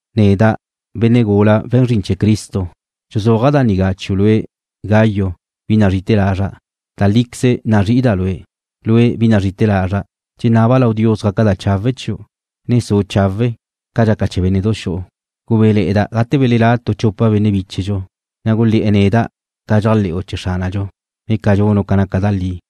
Neda', benne' gula we̱n zrin chee̱ Cristo, dxuzúaja' da nigá chiu' lue', Gayo, bi nazrí'ite̱ lazra'. Da líqueze nazrí'ida' lue'. Lue', bi nazrí'ite̱ lazra', dxenaba' lau Dios gaca da chawe' chiu', ne su' chawe', ca dxaca chee̱ bénne'du xu'u. Gubéle̱'e̱da' gate belelá' tu chupa benne' bíchedxu, ne gulé̱'e̱ neda' ca dxéajle̱'u chee̱ Xránadxu, ne ca dxunu' ca naca da li.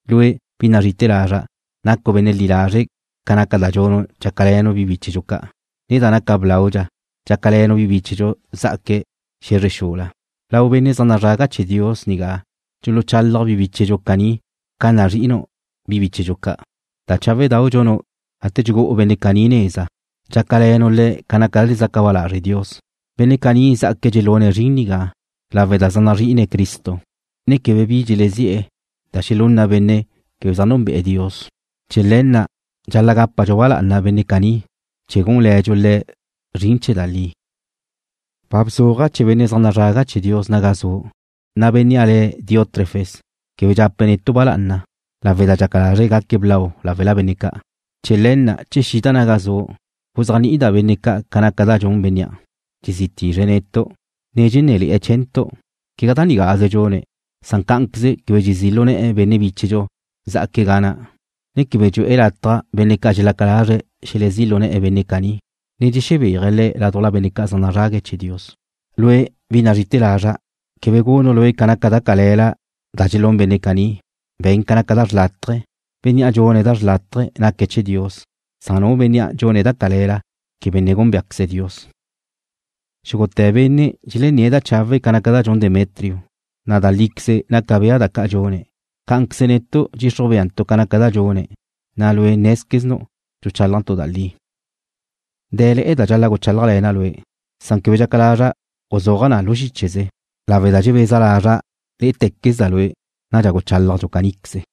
Lue', bi nazrí'ite̱ lazra', nacu' benne' li lazre' ca naca da dxunu' dxácale̱nu' bi bíchedxu ca', ne da naca blaudxa dxácale̱nu' bi bíchedxu za'aque̱' xe̱zre xula. Lau benne' zaj nazrague̱' chee̱ Dios nigá dxuluchalaj bi bíchedxu caní ca nazri'inu' bi bíchedxu ca'. Da cháwedau' dxunu' gate dxugú'u benne' caní neza, dxácale̱nu' le̱' ca naca da dxezaca ba lazre' Dios. Benne' caní zjaque̱' dxelune̱' zrin nigá lawe' da zaj nazri'ine̱' Cristo, ne quebe bi dxelezi'e̱ da xelunna benne' quebe zaj núnbe'e̱ Dios. Chee̱ le̱ na' dxal-la' gápadxu ba lá'ana benne' caní chee̱ gúnle̱dxu le̱' zrin chee̱ da li. Ba bzuaja' chee̱ benne' zaj nazrague̱' chee̱ Dios naga zu', na' bénnea' le̱' Diótrefes quebe dxape̱' netu' ba lá'ana lawe' da dxaca lazre̱' gaque̱' blau láwela benne' ca'. Chee̱ le̱ na', che xida' naga zu', guzéajni'ida' benne' ca' ca naca da dxun bénnea', dxezí tizre̱' netu', ne dxenné̱le̱'e̱ chee̱ntu'. Quegá da nigáze dxune̱', san cá'anqueze quebe dxezí' lu ne̱'e̱ benne' bíchedxu zá'aque̱' ga na', ne quebe dxu'e̱ lataj benne' ca' dxelaca lazre̱' xelezí' lu ne̱'e̱ benne' caní, ne dxexebéaje̱' le̱' ládujla benne' ca' zaj nazrague̱' chee̱ Dios. Lue', bi nazrí'ite̱ lazra', quebe gunu' lue' ca naca da cale̱la da dxelún benne' caní. Be̱n ca naca da xrlátaje. Bénnea' dxune̱' da xrlátaje naque̱' chee̱ Dios, san nu benne' dxune̱' da cale̱la, quebe ne gúnbeaqueze̱' Dios. Xúgute̱ benne' dxelenné̱' da chawe' ca naca da dxun Demetrio, na' da líqueze naca bea na ca dxune̱'. Cá'anqueze netu' dxixruj beantu' ca naca da dxune̱', na' lue' nézqueznu' dxuchálajntu' da li. Dé̱le̱'e̱ da dxal-la' guchálajle̱na' lue', san quebe dxaca lazra' guzúaja' na lu xícheze, lawe' da dxebeza lazra' lé'ete̱quezda' lue'. Nadxa guchálajdxu caníqueze.